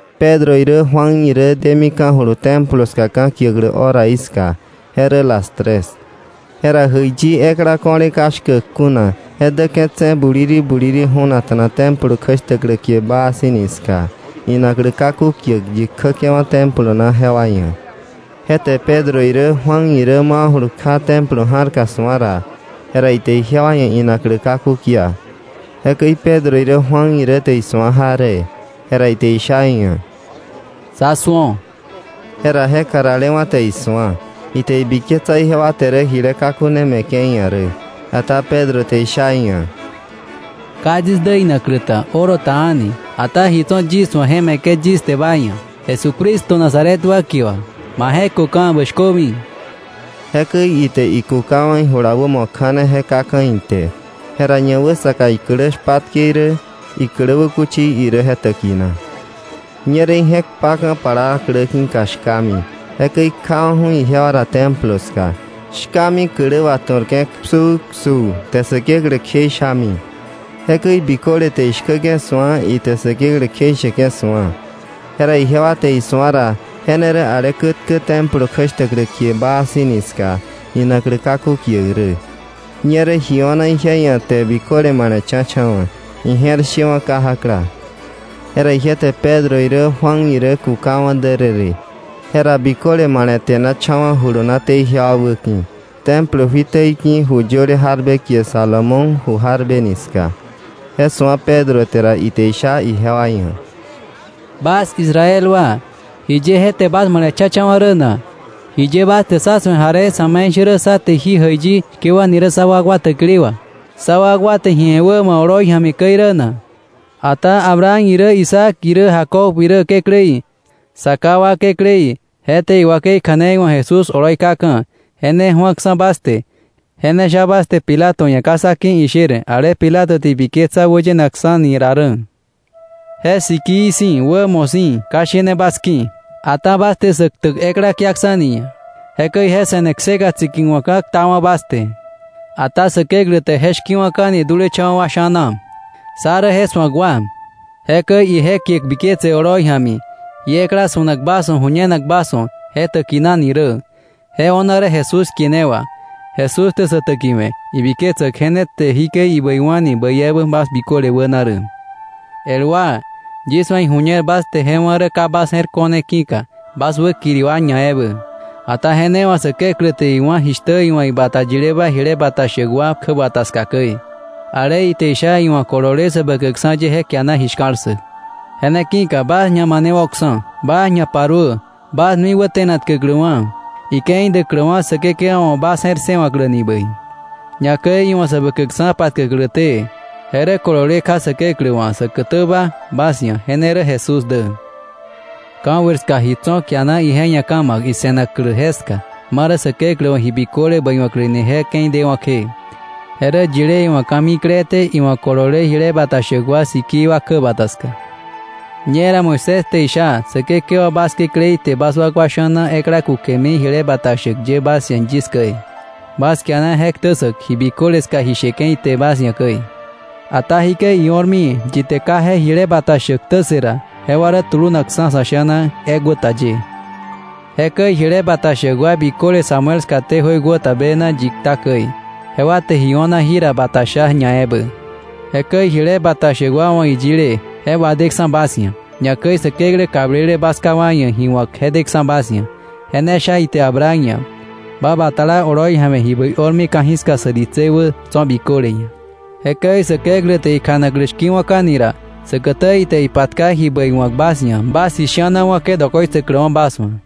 Pedro irä Juan irä demika̱julu Templo ska ka̱kiäklä horaí ska. Je rä las tres. Jera jäiyi ekla ko̱le ka shkäk kuna je däke̱tse̱ buliri buliri ju̱nakta̱na Templo kjäshtäklä kie Baa Si̱ ni ska inaklä kaku kiäk yi kjäke̱wa̱ Templo na jewa ia̱. Je te Pedro irä Juan irä mawa̱julu kja Templo ja̱rka su̱a ra, jera ite ijewa ia̱ inaklä kaku kia. Jekäi Pedro irä Juan irä te isu̱a jaree, jera ite isha iia̱: —Sá su̱o. Jera je karalewa̱ te isu̱a. Ite ibiketsa ijewa te rä jile kaku ne me̱ke̱ iia̱ rä. Ata Pedro te isha iia̱: —Ka yis dä inaklä ta, oro ta a̱ni. Ata ji tso̱ yis wa̱ je me̱ke̱ yis te ba ia̱. Jesucristo Nazaret wa kie wà ma je̱köka̱, bä shkömi. Jekäi ite ikukawa̱ ijula wämo kja̱ne je kaka̱ ite. Jera ñawäsaka iklä shpatke irä iklä wäkuchi irä je täkina. Ñerä ije̱k kpaka̱ plaa klä ki̱ka shkami, jekäi ikjawa̱ju̱ ijewa ra Templo ska, shkami klä wà, tu̱rke̱ psupsuu, te Säkeklä kjeishami. Jekäi biköle te ishkäke̱ su̱a, ite Säkeklä kjeisheke̱ su̱a. Jera ijewa te isu̱a ra je ne rä ale kätkä Templo kjäshtäklä kie Baa Si̱ ni ska inaklä kaku kiäk rä. Ñerä ji o̱na ije ia̱ te biköle male̱cha̱cha̱wa̱, ije̱r shewa̱ kajakla. Jera ije te Pedro irä Juan irä kukawa̱ därërë. Jera biköle male̱te̱nacha̱wa̱ julunaté ijewa wäki̱ Templo juiteí ki̱ ju yöle jarbe kie Salomón ju jarbe ni ska. Je su̱a Pedro te ra, ite isha ijewa ia̱: “Bas Israel wa, ¿jiye je te bas male̱cha̱cha̱wa̱ rä na? ¿Jiye bas te sá su̱e jaree sa̱me̱ishärä sá te jí jäiyi shkewa̱mi rä sá wakwa täkili wà, sá wakwa te ji we̱ wämo oloi ja̱mi käi rä na? Ata Abraham irä, Isaac irä, Jacob irä Kekläí, sa ká wa Kekläí, je te iwakei kja̱nei wa̱k Jesús oloi kaka̱. Je ne ju̱aksa̱ bas te, je ne sha bas te Pilato ia̱ ka sá ki̱ isher, ale Pilato te ibiketsa wäyenakksa̱ni ra rä. Je sikii si̱, wämo si̱ ka shene bas ki̱. Ata bas te sä ktäk ekla kiaksa̱ni iia̱. Jekäi je se̱ne kseka tsikiwa̱kka̱ ktawa̱ bas te. Ata Säkeklä te je shki̱wa̱ka̱ni dulecha̱wa̱ wa sha̱na. Sá rä je su̱ak wa. Jekäi ije kie biketse oloi ja̱mi jí ekla su̱nak bas wa̱ ju̱ñenak bas wa̱ je täkinani rä, je o̱na rä Jesús kie ne wà. Jesús te sä täkiwe̱ ibiketsäk je ne te jikäi ibäiwa̱ni bäi ebä bas biköle wäna rä. “El wa, yis wa̱ iju̱ñer bas te je wá̱ rä ka bas je̱r ko̱ne ki̱ka, bas wäkiri wa ñaebä. Ata je ne wà Säkeklä te iwá̱ jishtä iwa̱ ibata yileba jile bata shäk wa kjäbata ska käi, ale ite isha, iwa̱ kolole Säbäkäkksa̱ ye je kiana ji shka̱l ssäk. Je ne ki̱ka bas ñamanewo̱ksa̱, bas ñaparuö bas nui wäte̱natkäkläwa̱, ike̱i däkläwa̱ Säkekewa wa̱ bas je̱r ssëwa̱kläni bäi, ñakäi iwa̱ Säbäkäkksa̱ patkäkläté. Je rä kolole kja Säkeklä wa̱ säkätäba bas ia̱, je ne rä Jesús dä. Ka̱jöir ska ji tso̱ kiana ije ia̱ ka̱ ma̱k ise̱naklä jeska, ma rä Säkeklä wa̱ ji biköle bäiwa̱kläni je ke̱i dewa̱ kje, je rä yile iwa̱ ka̱mikleté, iwa̱ kolole jile bata shäk wa sikii wa ye jewa kjäbata ska. Ñera Moisés te isha: ‘Säkekewa bas Kekläí te bas wakwa sha̱na ekla kukemi jile bata shäk ye bas ia̱ yis käi. Bas kiana je ktä ssäk ji biköle ska ji sheke̱ ite bas ia̱ käi. Ata jikäi io̱rmi, yi te ka je jile bata shäk ktä ssë ra, jewa rä tulunakksa̱ sa̱ sha̱na ekwäta ye.’ “Jekäi jile bata shäk wa biköle Samuel skaté jöiwäta bena yi kta käi, jewa te ji o̱na jira bata sha ñaebä. Jekäi jile bata shäk wa wa̱ ji yile je wadeksa̱ bas ia̱. Ñakäi Säkeklä kablele bas ká wa ia̱ ji wa̱k je deksa̱ bas ia̱. Je ne sha ite Abraham ia̱: ‘Ba batala oloi ja̱mi ji bäi o̱rmi ka̱jiska sä ditsei wä tso̱ biköle ia̱.’ Jekäi Säkeklä te ikjanaklä shki̱wa̱ka̱ni ra, säkätä ite ipatka ji bäi wa̱k bas ia̱, bas ji shi̱ana wa̱ke̱ dokoitsäkläwa̱ bas wa̱.”